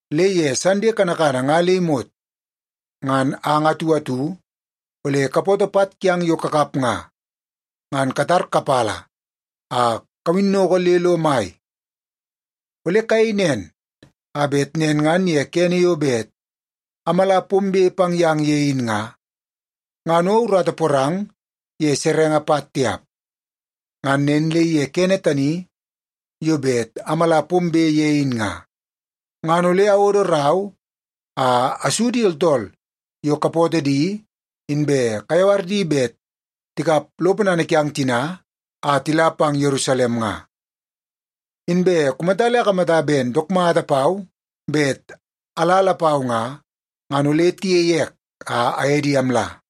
Le ye Sande kanakana nga le imot, ngan ang atu atu ole kapoto pat kiang yo kakap nga, ngan katar kapala a kawinnoko le lo mai. Ole kayei nen a bet nen ngan ye kene yo bet amala pombe pang yang ye in nga, ngan o urata porang ye serenge pat tiap. Ngan nen le ye kene tani yo bet amala pombe ye in nga, ngan ole awodo rau a asu di tooltool yo kapootoo di inbe kayawar di bet tikap lo ponana kiang tina a tila pang Yerusalem nga. Inbe kumata le akamata ben dook mata pau bet ala lapau nga, ngan ole tiyei ek a aye di amla.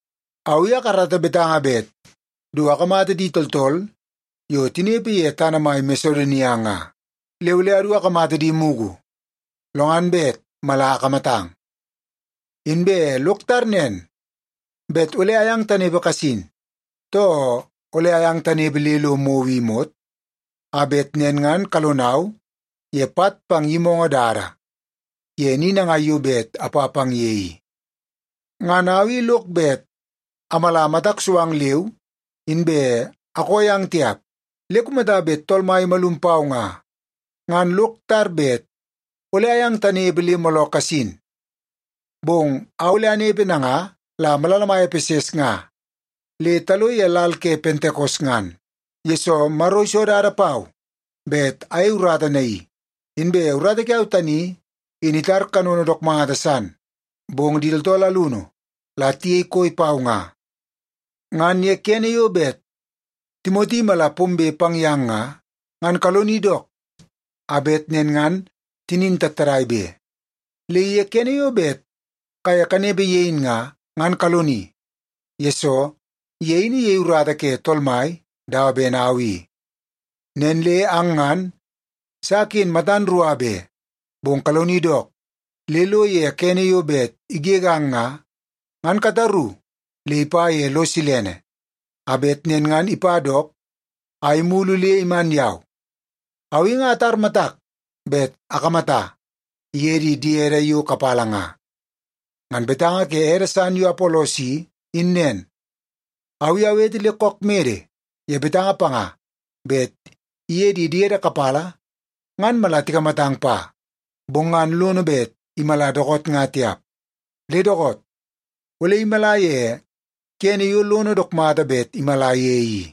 Au i akarata betanga bet du akamata di tooltool yo tinepe ye tana mai Masedonia nga. Le ole adu akamata di mugu, lo ngan bet mala akamatang. Inbe lok tar nen bet ole ayang tanepe kasin, too ole ayang tanepe le lo mou i imot, a bet nen ngan kalonau ye pat pang yimoongoo dada ye ni nangai yo bet apa pang ye i. Ngan au i lok bet amala matak so ang leu inbe akoo yang tiap. Le kumata bet Tool Mai imalum pau nga, ngan lok tar bet ole ayang tanepe le mooloo kasin. Bong au ole anepe nanga la malala mai Epeses nga le talo ye lal ke Pentekos ngan, yesoo Maro iso dada pau bet ayei urata naii. Inbe urata kiau tani in itara kanono dook mata san, bong di tooltool alunu la tiyei koi pau nga. Ngan ye kene yo bet Timoti imala pombe pang yang nga, ngan kaloni dook a bet nen ngan tinin tattadai be. Le ye kene yo bet kaye kanepe ye in nga, ngan kaloni, yesoo ye in iyei urata ke Tool Mai dawa ben au i. Nen le ang ngan sa ken matan rua be. Bong kaloni dook le lo ye kene yo bet igegang nga, ngan kataru le ipa ye lo silene, a bet nen ngan ipa dook a imulu le iman yau. Au i nga atar matak bet akamata iye di diede yo kapala nga. Ngan betanga ke ede san yo Apolos i, in nen. Au i awete le kook mede ye betanga panga bet iye di diede kapala ngan mala tikamatang pa, bong ngan lono bet imala dookoot nga tiap. Le dookoot, ole imala ye kene yo lono dook mata bet imala ye i.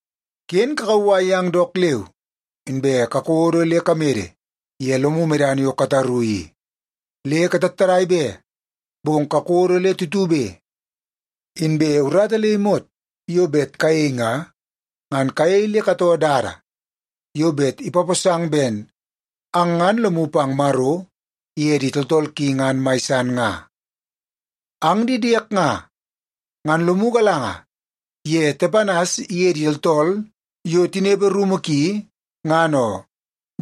Ken kakauwai yang dook leu, inbe kakodo le kamede ye lomu medana yo kataru i. Le katattadai be, bong kakodo le tutube. Inbe urata le imot yo bet kayei nga, ngan kayei le katoo dada yo bet ipaposang ben ang ngan lomu pang Maro iye di tooltool ki ngan mai san nga. Ang di diek nga, ngan lomu galanga ye Tepanas iye di tooltool yo tinepe rumu ki, ngan oo.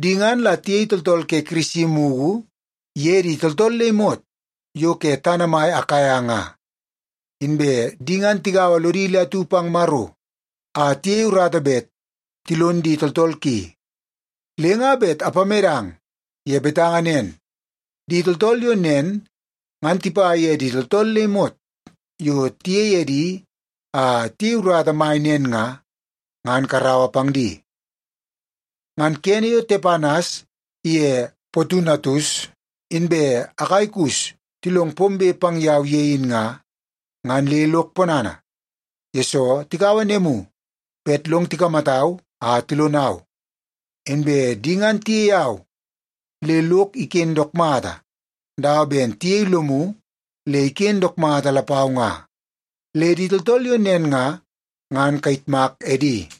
Di ngan la tiyei tooltool ke Kirisi mugu ye di tooltool le imot yo ke tana mai Akaia nga. Inbe di ngan tigaua lodi le atu pang Maro a tiyei urata bet tilon di tooltool ki. Le nga bet apamedang ye betanga nen, di tooltool yo nen ngan tipa ye di tooltool le imot yo tiyei edi a tiyei urata mai nen nga, ngan karaua pang di. Ngan kene yo Tepanas ye Potunatus inbe Akaikus tilong pombe pang yau ye in nga, ngan le lok ponana, yesoo tikaua nemu bet long tikamatau a tilonau. Inbe di ngan tiyei au le lok iken dook mata, dawa ben tiyei lomu le iken dook mata lapau nga. Le di tooltool yo nen nga, ngan kayitmak edi.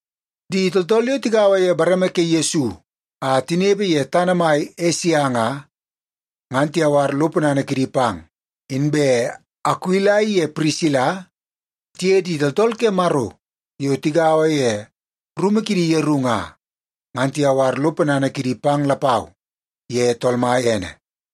Di tooltool yo tigaua ye bareme ke Yesu a tinepe ye tana mai Esia nga, ngan tiyawar lo ponana kidi pang. Inbe Akuila iye Pirisila tiye di tooltool ke Maro yo tigaua ye rumu kidi yeru nga, ngan tiyawar lo ponana kidi pang lapau ye Tool Mai ene.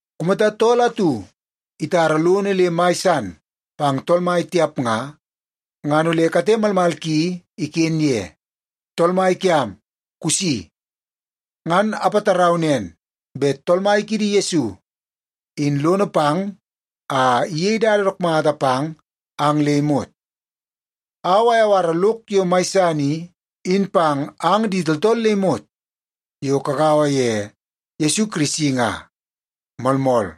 Kumata tool atu itara lono le mai san pang Tool Mai tiap nga, ngan ole kate malmal ki iken ye. Tool Mai kiam kusi! Ngan apatarau nen bet Tool Mai kiidi Yesu, in lono pang a iyei dada dook mata pang ang le imot. Au ayawara lok yo mai san i, in pang ang di tooltool le imot yo kagaua ye Yesu Kirisi nga. Moolmool.